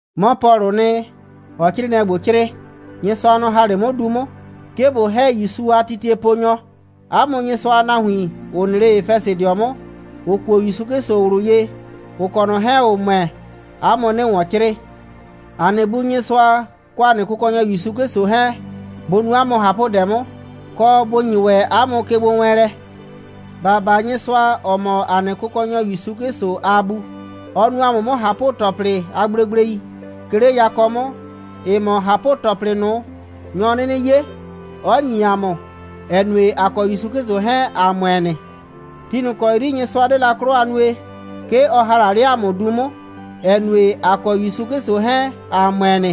'Mɔ Pɔlʋʋ nɩ, ‑ɔɔ 'crɩɩnɩɛ ‑gbo 'crɩɩ. Nyɩsʋa, nɔ‑ ‑ha 'le 'mʋ du 'mʋ, 'ke ꞊bo ‑hɛ ‑Yusu 'Klɩsʋ a titieponyɔ. 'A mʋ Nyɩsʋa a nahuin, ‑ʋ nɩ 'le Efɛsɩdɩɔ 'mʋ, ‑ʋ kuo ‑Yusu 'Klɩsʋ ꞊wlʋ ye, ‑ʋ kɔ ꞊nɔ 'hɛɛn, ‑ʋ ‑mʋɛ, 'a mʋ 'nɩɩ ‑wɔn 'crɩɩ. ‑A nɩ Bu Nyɩsʋa, kɔ ‑a nɩ Kʋkɔnyɔ ‑Yusu 'Klɩsʋ 'hɛɛn, bʋ nu 'a mʋ ꞊hapʋdɛ 'mʋ, kɔ, bʋ ‑nyi ‑wɛ 'a mʋ kegbowɛɛnlɛ. ‑Ba baa Nyɩsʋa, ‑ɔ mɔ ‑a nɩ Kʋkɔnyɔ ‑Yusu 'Klɩsʋ a Bu. Ɔ nu ‑a mʋ 'mʋ ꞊hapʋ‑tɔplɩ a gblegblei, 'ke 'le yakɔ 'mʋ, ‑ɩ mɔ ꞊hapʋ‑tɔplɩ ꞊nʋ, nyɔ 'nɩnɩ 'ye, 'ɔ ‑nyi ‑a mʋ, ‑ɛ nue, ‑a kɔ ‑Yusu 'Klɩsʋ 'hɛɛn, ‑a ‑mʋɛ nɩ. Ti ꞊nʋ kɔ 'yri Nyɩsʋa 'de la 'klɔ a nue, 'ke ɔ ‑ha la 'le ‑a mʋ du 'mʋ, ‑ɛ nue, ‑a kɔ ‑Yusu 'Klɩsʋ 'hɛɛn, ‑a ‑mʋɛ nɩ,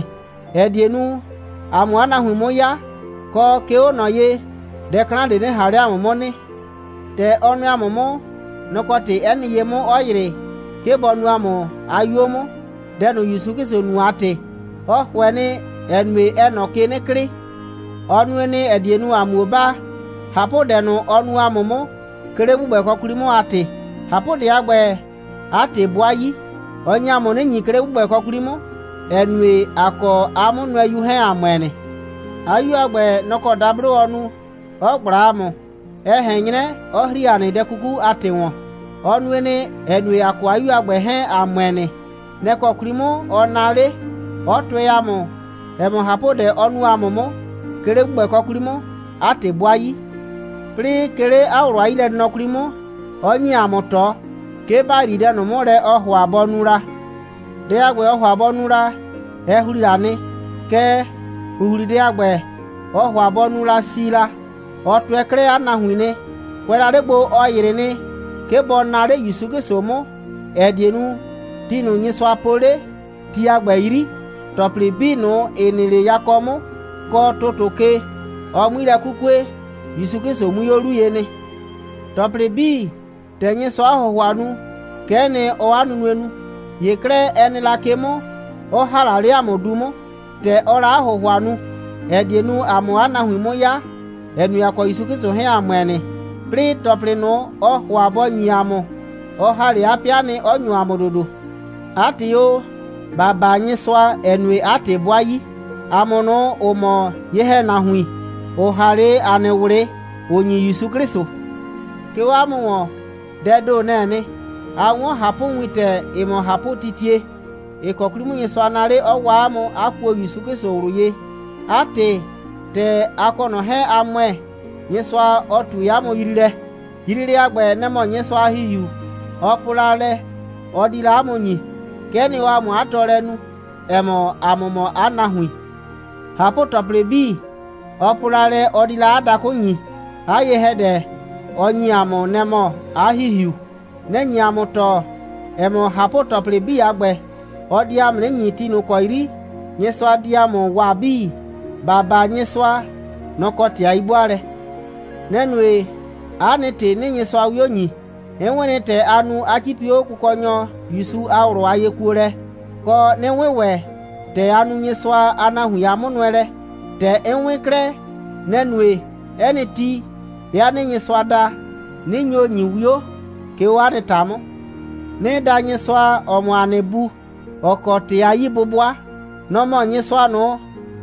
‑ɛ die nu, ‑a 'mʋ 'a nahuin 'mʋ 'ya, kɔ, 'ke 'o ꞊nɔ ye, dɛ 'klan ꞊de 'nɩ ꞊han 'le ‑a mʋ 'mʋ nɩ. ‑Tɛ ɔ nʋɛ ‑a mʋ 'mʋ, nɛ‑ kɔ ‑tɩ, 'ɛ nɩ ye 'mʋ, 'ɔ ‑yrɩ, 'ke bɔ nuu ‑a mʋ 'a 'yuo 'mʋ, dɛ ꞊nʋ, ‑Yusu 'Klɩsʋ nu a ‑tɩ. Ɔ ‑hʋɛ nɩ, ‑ɛ nue, ɛɛ ꞊nɔ ke 'nɩ klɩɩ. Ɔ nue nɩ, ‑ɛ die nu, ‑a 'muo baa, ꞊hapʋdɛ ꞊nʋ, ɔ nu ‑a mʋ 'mʋ, 'ke 'le ‑gbʋgbɛkɔ 'kwli 'mʋ a ‑tɩ. ꞊Hapʋdɛ a ‑gbɛ, 'a ‑tɩ 'bʋa 'yi. Ɔ nye ‑a mʋ 'nɩ ‑nyi, 'ke 'le ‑gbʋgbɛkɔ 'kwli 'mʋ, ‑ɛ nue, ‑a kɔ 'a 'Mʋnʋɛyu 'hɛɛn, ‑a ‑mʋɛ nɩ. 'A 'Yu a ‑gbɛ, nɔ‑ kɔ dablo ɔ nu, 'ɔ ꞊gbla ‑a mʋ, ɛ ꞊hɛn 'nyrɛ, ɔ ‑hri ‑a nɩ dɛ 'kuku a ‑tɩ ‑wɔn. Ɔ nue nɩ, ‑ɛ nue, ‑a kɔ 'a 'Yu a ‑gbɛ 'hɛɛn, ‑a ‑mʋɛ nɩ. Nɛ‑ kɔ 'kwli 'mʋ, ɔ naa 'le, 'ɔ tʋɛ ‑a mʋ, ‑ɛ mɔ, ꞊hapʋdɛ, ɔ nu ‑a mʋ 'mʋ, 'ke 'le ‑gbʋgbɛkɔ 'kwli 'mʋ, 'a ‑tɩ 'bʋa 'yi. 'Plɩɩ, 'ke 'le 'a ꞊wlʋ a 'yilɛnɩnɔ 'kwli 'mʋ, 'ɔ ‑nyi ‑a mʋ ꞊tɔ, 'ke ‑ba yrii dɛ ꞊nʋ 'mʋ lɛ, ɔɔ ‑hʋa bɔ nu la. Dɛ a ‑gbɛ, ɔɔ ‑hʋa bɔ nu la, ɛ ‑hli la nɩ. Kɛɛ, ‑huhlidɛ a ‑gbɛ, ɔɔ ‑hʋa bɔ nu la si la, ɔ tʋɛ 'klɛɛ 'a nahuin nɩ. Kʋɛ la 'le gbo, ɔ ‑yrɩ nɩ, 'ke bɔ naa 'le ‑Yusu 'Klɩsʋ 'mʋ, ‑ɛ die nu, ti ꞊nʋ, Nyɩsʋa po 'le, ti a ‑gbɛ 'yri, ‑tɔplɩ 'bii ꞊nʋ, ‑ɩ nɩ 'le yakɔ 'mʋ kɔ ‑tʋtʋ ke, ɔ 'mui lɛ 'kukue, ‑Yusu 'Klɩsʋ 'mui 'o 'lu ye nɩ. ‑Tɔplɩ 'bii, ‑tɛ Nyɩsʋaa 'a ‑hʋhʋa nu, kɛ'ɛ nɩ, ɔɔ 'a nunue nu. ‑Ye 'klɛɛ, ɛ nɩ la ke 'mʋ, 'ɔ ‑ha la 'le ‑a mʋ du 'mʋ, ‑tɛ ɔɔ la 'a ‑hʋhʋa nu, ‑ɛ die nu, ‑a 'mʋ 'a nahuin 'mʋ 'ya, ‑ɛ nue, ‑a kɔ ‑Yusu 'Klɩsʋ 'hɛɛn, ‑a ‑mʋɛ nɩ. 'Plɩɩ, ‑tɔplɩ ꞊nʋ, ɔɔ ‑hʋa bɔ ‑nyi ‑a mʋ, ɔ ‑ha 'le ‑a nɩ 'pɩa nɩ, 'ɔ ‑nyo ‑a mʋ ‑dodo. 'A ‑tɩ o, ‑ba baa Nyɩsʋa, ‑ɛ nue, 'a ‑tɩ 'bʋa 'yi, ‑a mʋ ꞊nʋ, ‑ʋ mɔ ye‑hɛnahuin, ‑ʋ ‑ha 'le ‑a nɩ ꞊wlɩ, ‑ʋ ‑nyi ‑Yusu 'Klɩsʋ. 'Ke 'o 'a mʋ ‑wɔn, dɛɛ ‑do, nɛ‑ɛ nɩ. A 'wɔn ꞊hapʋwintɛ, ‑ɩ mɔ ꞊hapʋtitie, ‑ɩ kɔ 'kwli 'mʋ, Nyɩsʋa naa 'le, 'ɔ waa 'a mʋ, 'a kuo ‑Yusu 'Klɩsʋ ꞊wlʋ ye. 'A ‑tɩ, ‑tɛ a kɔ ꞊nɔ 'hɛɛn, a ‑mʋɛ, Nyɩsʋa, ɔ ꞊tue 'a mʋ yriilɛ. Yriilɛ a ‑gbɛ, nɛ‑ mɔ Nyɩsʋa a ‑Hihiu, ɔ po la lɛ, ɔ di la 'a mʋ ‑nyi. Kɛ'ɛ nɩ, ɔɔ ‑a mʋ 'a tɔɔlɛ nu, ‑ɛ mɔ, ‑a mʋ mɔ 'a nahuin. ꞊Hapʋ‑tɔplɩ 'bii, ɔ po la lɛ, ɔ di la 'a dakʋ ‑nyi, 'a ye‑hɛdɛ, ɔ ‑nyi ‑a mʋ, nɛ‑ mɔ 'a ‑Hihiu. Nɛ‑ nye ‑a mʋ tɔɔ, ‑ɛ mɔ, ꞊hapʋ‑tɔplɩ 'bii a ‑gbɛ, ɔ di ‑a mʋ 'nɩ ‑nyi ti ꞊nʋ ‑kɔ 'yri Nyɩsʋa di ‑a mʋ waa 'bii. ‑Ba baa Nyɩsʋa. Nɔ‑ kɔ ‑tɩ a 'yi'bʋaalɛ. Nɛ‑ nue, 'a nɩ ‑tɩ 'nɩɩ Nyɩsʋa 'wio ‑nyi. 'N 'wɩn nɩ, ‑tɛ a nu, 'a 'cipi 'o Kʋkɔnyɔ ‑Yusu a ꞊wlʋ a yekuolɛ, kɔ, 'nɩ 'wɩn ‑wɛ, ‑tɛ a nu Nyɩsʋa a nahuin a 'mʋnʋɛlɛ. ‑Tɛ 'n 'wɩn 'klɛɛ, nɛ‑ nue, 'ɛ nɩ ti, 'bɩa 'nɩɩ Nyɩsʋa da, 'nɩ nyo ‑nyi 'wio, 'ke 'o 'a nɩ ‑ta 'mʋ. 'Nɩɩ da Nyɩsʋa, ‑ɔ mɔ ‑a nɩ Bu, ‑ɔ kɔ ‑tɩ a 'yi'bʋbʋa. Nɔ‑ mɔ Nyɩsʋa ꞊nʋ,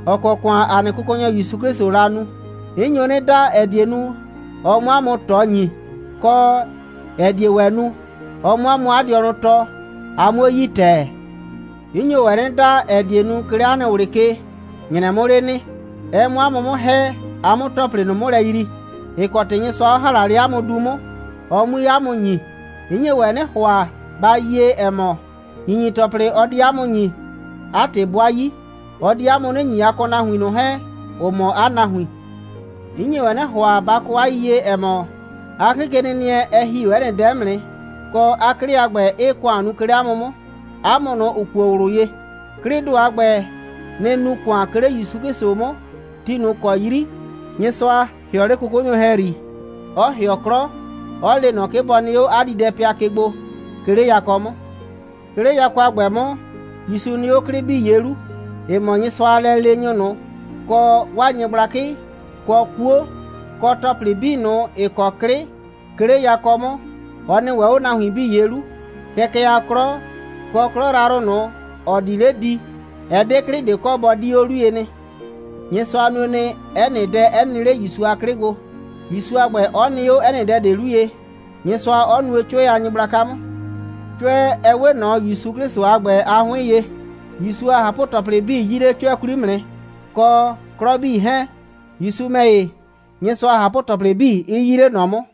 ‑ɔ kɔ ‑kʋan ‑a nɩ Kʋkɔnyɔ ‑Yusu 'Klɩsʋʋ la nu. 'N nyo 'nɩ da, ‑ɛ die nu, ɔ 'mʋ 'a mʋ ꞊tɔ ‑nyi, kɔ, ‑ɛ die ‑wɛ nu, ɔ 'mʋ 'a mʋ 'a dɩɔnʋ tɔɔ, a 'muo yi ‑tɛɛ. 'N nyo ‑wɛ 'nɩ da, ‑ɛ die nu, 'ke 'le 'a nɩ ꞊wlɩ ke, ‑nyrɛ 'mʋ 'le nɩ, ɛ 'mʋ 'a mʋ 'mʋ ‑hɛ, a 'mʋ ‑tɔplɩ ꞊nʋ 'mʋ lɛ yrii, ‑ɩ kɔ ‑tɩ Nyɩsʋa 'ɔ ‑ha 'le 'a mʋ du 'mʋ, ɔ 'mui 'a mʋ ‑nyi. 'N nye ‑wɛ 'nɩ ‑hʋa, ba yie, ‑ɛ mɔ, ‑nyinyi‑tɔplɩ, ɔ di 'a mʋ ‑nyi, 'a ‑tɩ 'bʋa 'yi. Ɔ di 'a mʋ 'nɩ ‑nyi, a kɔ nahuin ‑ye ꞊nʋ 'hɛɛn, ‑ʋ mɔ 'a nahuin. 'N nye ‑wɛ 'nɩ ‑hʋa, ba yie, ‑ɛ mɔ, 'a 'klɩkenɩnɩɛ, ɛ ‑hi 'o 'ɛ nɩ dɛ 'mʋ nɩ, kɔ, 'a 'klɩ a ‑gbɛ 'ɩɩ ‑kʋan nu, 'ke 'le ‑a mʋ 'mʋ, ‑a mʋ ꞊nʋ, ‑ʋ kuo ꞊wlʋ ye. 'Klɩɩ ‑do a ‑gbɛ, nɩ‑ nu ‑kʋan, 'ke 'le ‑Yusu 'Klɩsʋ 'mʋ, ti ꞊nʋ ‑kɔ 'yri Nyɩsʋa ‑hɩɔ 'le 'kʋkʋnyʋ ‑hɛyri, ɔ ‑hɩɔ 'klɔ, 'ɔ le ꞊nɔ, 'ke bɔ nɩ 'o 'a diidɛpɩa ke gbo, 'ke 'le yakɔ 'mʋ. 'Ke 'le yakɔ a ‑gbɛ 'mʋ, ‑Yusu nɩ 'o 'klɩ 'bii ye 'lu, ‑ɩ mɔ Nyɩsʋa a lɛleenyʋ ꞊nʋ, kɔ 'waa nyɩgblakɩ, kɔ 'kuo, kɔ ‑tɔplɩ 'bii ꞊nʋ, ‑ɩ kɔ 'klɩ, 'ke 'le yakɔ 'mʋ. Ɔ nɩ ‑wɛ 'o nahuin 'bii ye 'lu. Kɛkɛ a 'klɔ, kɔ 'klɔ yrayrʋ ꞊nʋ, ‑ɔ di 'le di, ɛ 'de 'klɩ ꞊de kɔ, bɔ 'di 'o 'lu ye nɩ. Nyɩsʋa nue nɩ, 'ɛ nɩ dɛ 'ɛ nɩ 'le ‑Yusu a 'klɩ gbo, ‑Yusu a ‑gbɛ 'ɔ nɩ 'o 'ɛ nɩ dɛ ꞊de 'lu ye, Nyɩsʋa 'ɔ nuo 'cʋɛ a nyɩgblaka 'mʋ. 'Cʋɛ, ɛ 'we ꞊nɔ ‑Yusu 'Klɩsʋ a ‑gbɛ a 'hʋɩn ye. ‑Yusu a ꞊hapʋ‑tɔplɩ 'bii 'yii 'le 'cʋɛ 'kwli 'mʋ nɩ, kɔ 'klɔ 'bii 'hɛɛn, ‑Yusu ‑mɛ ‑ye, Nyɩsʋa a ꞊hapʋ‑tɔplɩ 'bii 'ɩ 'yii 'le ꞊nɔ 'mʋ.